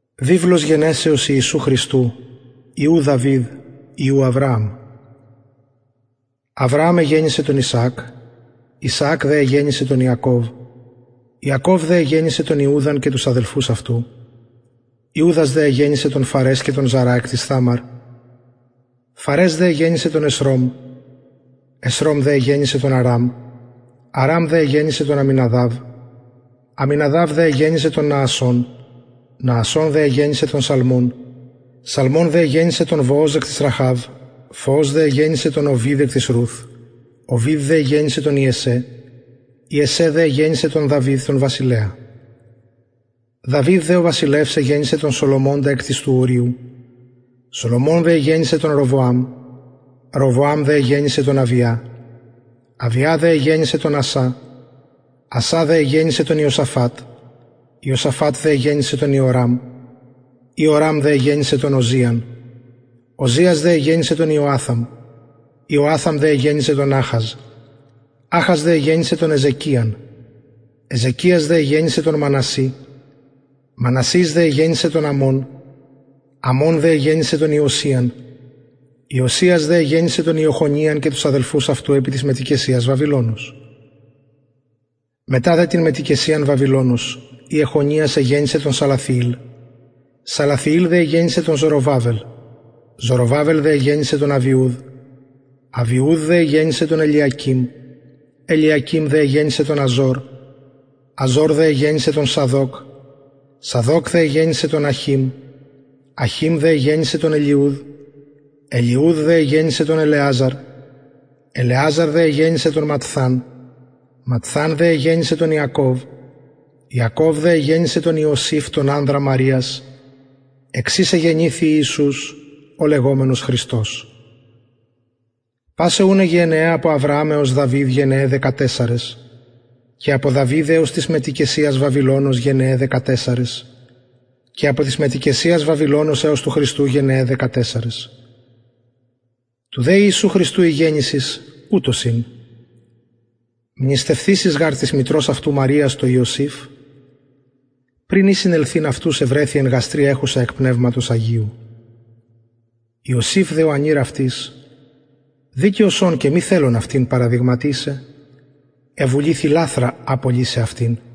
βιβλος γενεσεως ιησου χριστου υιου δαυιδ υιου αβρααμ αβρααμ εγεννησεν τον ισαακ ισαακ δε εγεννησεν τον ιακωβ ιακωβ δε εγεννησεν τον ιουδαν και τους αδελφους αυτου ιουδας δε εγεννησεν τον φαρες και τον ζαρα εκ της θαμαρ φαρες δε εγεννησεν τον εσρωμ εσρωμ δε εγεννησεν τον αραμ αραμ δε εγεννησεν τον αμιναδαβ αμιναδαβ δε εγεννησεν τον ναασσων ναασσων δε εγεννησεν τον σαλμων σαλμων δε εγεννησεν τον βοοζ εκ της ραχαβ βοοζ δε εγεννησεν τον ωβηδ εκ της ρουθ ωβηδ δε εγεννησεν τον ιεσσαι ιεσσαι δε εγεννησεν τον δαυιδ τον βασιλεα δαυιδ δε ο βασιλευς εγεννησεν τον σολομωνα εκ της του ουριου σολομων δε εγεννησεν τον ροβοαμ ροβοαμ δε εγεννησεν τον αβια αβια δε εγεννησεν τον ασα ασα δε εγεννησεν τον ιωσαφατ ιωσαφατ δε εγεννησεν τον ιωραμ ιωραμ δε εγεννησεν τον οζιαν οζιας δε εγεννησεν τον ιωαθαμ ιωαθαμ δε εγεννησεν τον αχαζ αχαζ δε εγεννησεν τον εζεκιαν εζεκιας δε εγεννησεν τον μανασση μανασσης δε εγεννησεν τον αμων αμων δε εγεννησεν τον ιωσιαν ιωσιας δε εγεννησεν τον ιεχονιαν και τους αδελφους αυτου επι της μετοικεσιας βαβυλωνος μετα δε την μετοικεσιαν βαβυλωνος ιεχονιας εγεννησεν τον σαλαθιηλ σαλαθιηλ δε εγεννησεν τον ζοροβαβελ ζοροβαβελ δε εγεννησεν τον αβιουδ αβιουδ δε εγεννησεν τον ελιακειμ ελιακειμ δε εγεννησεν τον αζωρ αζωρ δε εγεννησεν τον σαδωκ σαδωκ δε εγεννησεν τον αχειμ αχειμ δε εγεννησεν τον ελιουδ ελιουδ δε εγεννησεν τον ελεαζαρ ελεαζαρ δε εγεννησεν τον ματθαν ματθαν δε εγεννησεν τον ιακωβ ιακωβ δε εγεννησεν τον ιωσηφ τον ανδρα μαριας εξ ης εγεννηθη ιησους ο λεγομενος χριστος πασαι ουν αι γενεαι απο αβρααμ εως δαυιδ γενεαι δεκατεσσαρες και απο δαυιδ εως της μετοικεσιας βαβυλωνος γενεαι δεκατεσσαρες και απο της μετοικεσιας βαβυλωνος εως του χριστου γενεαι δεκατεσσαρες του δε ιησου χριστου η γεννησις ουτως ην μνηστευθεισης γαρ της μητρος αυτου μαριας τω ιωσηφ πριν η συνελθειν αυτους ευρεθη εν γαστρι εχουσα εκ πνευματος αγιου ιωσηφ δε ο ανηρ αυτης δικαιος ων και μη θελων αυτην παραδειγματισαι εβουληθη λαθρα απολυσαι αυτην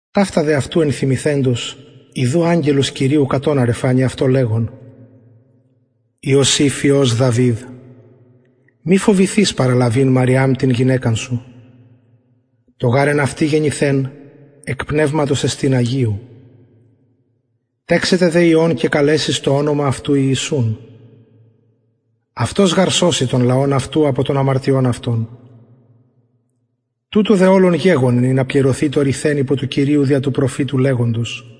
ταυτα δε αυτου ενθυμηθεντος ιδου αγγελος κυριου κατ οναρ εφανη αυτω λεγων ιωσηφ υιος δαυιδ μη φοβηθης παραλαβειν μαριαμ την γυναικα σου το γαρ εν αυτη γεννηθεν εκ πνευματος εστιν αγιου τεξεται δε υιον και καλεσεις το ονομα αυτου ιησουν αυτος γαρ σωσει τον λαον αυτου απο των αμαρτιων αυτων τουτο δε ολον γεγονεν ινα πληρωθη το ρηθεν υπο του κυριου δια του προφητου λεγοντος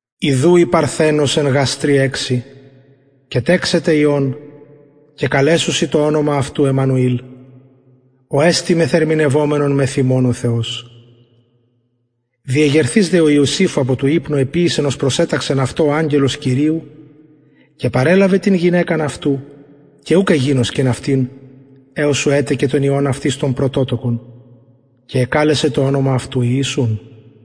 ιδου η παρθενος εν γαστρι εξει και τεξεται υιον και καλεσουσιν το ονομα αυτου εμμανουηλ ο εστιν μεθερμηνευομενον μεθ ημων ο θεος διεγερθεις δε ο ιωσηφ απο του υπνου εποιησεν ως προσεταξεν αυτω ο αγγελος κυριου και παρελαβεν την γυναικα αυτου και ουκ εγινωσκεν αυτην εως ου ετεκεν τον υιον αυτης τον πρωτοτοκον και εκαλεσεν το ονομα αυτου ιησουν